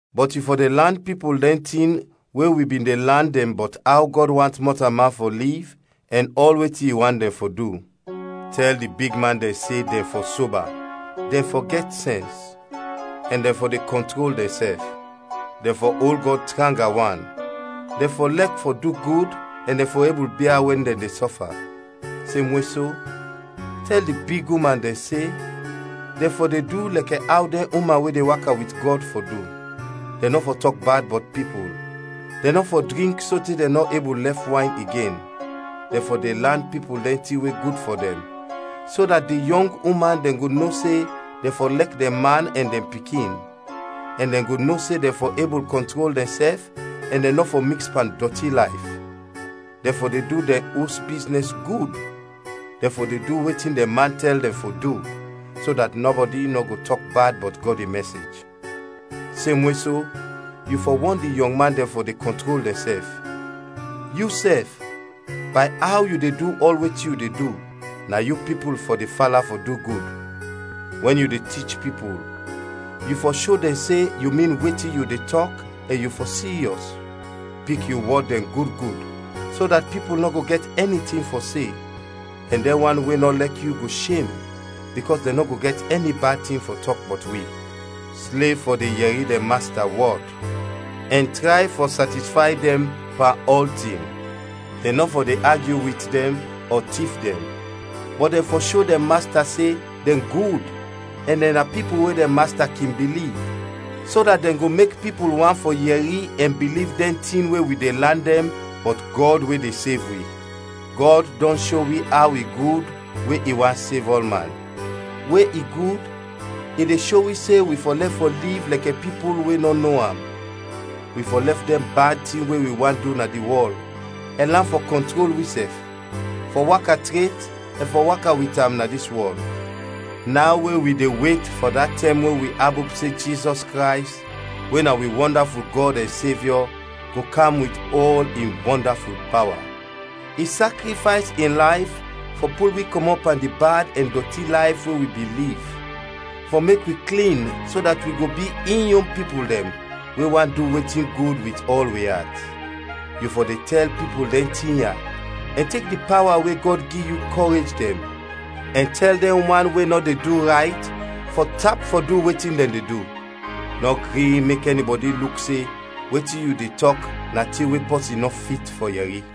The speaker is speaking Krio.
Bɔt yu fɔ de lan pipul dɛn tin we wi bin de lan dɛn bɔt aw Gɔd want mɔtalman fɔ liv ɛn ɔl wetin i want dɛn fɔ du. Tɛl di bigman dɛn se dɛn fɔ soba, dɛn fɔ gɛt sɛns, ɛn dɛn fɔ de kɔntrol dɛnsɛf; dɛn fɔ ol Gɔd tranga wan, dɛn fɔ lɛk fɔ du gud ɛn dɛn fɔ ebul bia wɛn dɛn de sɔfa. Semwe so, tɛl di big uman dɛn se dɛn fɔ de du lɛkɛ aw dɛn uman we de waka wit Gɔd fɔ du. Dɛn nɔ fɔ tɔk bad bɔt pipul, dɛn nɔ fɔ drink sote dɛn nɔ ebul lɛf wayn igen. Dɛn fɔ de lan pipul dɛn tin we gud fɔ dɛn, so dat di yɔng uman dɛn go no se dɛn fɔ lɛk dɛn man ɛn dɛn pikin, ɛn dɛn go no se dɛn fɔ ebul kɔntrol dɛnsɛf ɛn dɛn nɔ fɔ miks pan dɔti layf, dɛn fɔ de du dɛn os biznɛs gud, dɛn fɔ de du wetin dɛn man tɛl dɛn fɔ du, so dat nɔbɔdi nɔ go tɔk bad bɔt Gɔd in mɛsej. Semwe so, yu fɔ wɔn di yɔng man dɛn fɔ de kɔntrol dɛnsɛf. Yusɛf, bay aw yu de du ɔl wetin yu de du, na yu pipul fɔ de fala fɔ du gud. Wɛn yu de tich pipul, yu fɔ sho dɛn se yu min wetin yu de tɔk ɛn yu fɔ siryɔs. Pik yu wɔd dɛn gud gud so dat pipul nɔ go gɛt ɛni tin fɔ se, ɛn dɛn wan we nɔ lɛk yu go shem, bikɔs dɛn nɔ go gɛt ɛni bad tin fɔ tɔk bɔt wi. Slev fɔ de yɛri dɛn masta wɔd ɛn tray fɔ satisfay dɛn pan ɔltin. Dɛn nɔ fɔ de agyu wit dɛn ɔ tif dɛn. Bɔt dɛn fɔ sho dɛn masta se dɛn gud ɛn dɛn na pipul we dɛn masta kin biliv, so dat dɛn go mek pipul want fɔ yɛri ɛn biliv dɛn tin we wi de lan dɛn bɔt Gɔd we de sev wi. Gɔd dɔn sho wi aw i gud we i want sev ɔlman. We i gud, i de sho wi se wi fɔ lɛf fɔ liv lɛkɛ pipul we nɔ no am, wi fɔ lɛf dɛn bad tin we wi want du na di wɔl, ɛn lan fɔ kɔntrol wisɛf, fɔ waka tret, ɛn fɔ waka wit am na dis wɔl, naw we wi de wet fɔ da tɛm we wi abop se Jizɔs Krays, we na wi wɔndaful Gɔd ɛn Sevyɔ go kam wit ɔl in wɔndaful pawa. I sakrifays in layf fɔ pul wi kɔmɔt pan di bad ɛn dɔti layf we wi bin liv, fɔ mek wi klin so dat wi go bi in yon pipul dɛn we want du wetin gud wit ɔl wi at. Yu fɔ de tɛl pipul dɛn tin ya ɛn tek di pawa we Gɔd gi yu kɔrej dɛn, ɛn tɛl dɛn wan we nɔ de du rayt fɔ tap fɔ du wetin dɛn de du. Nɔ gri mek ɛnibɔdi luk se wetin yu de tɔk na tin we pɔsin nɔ fit fɔ yɛri.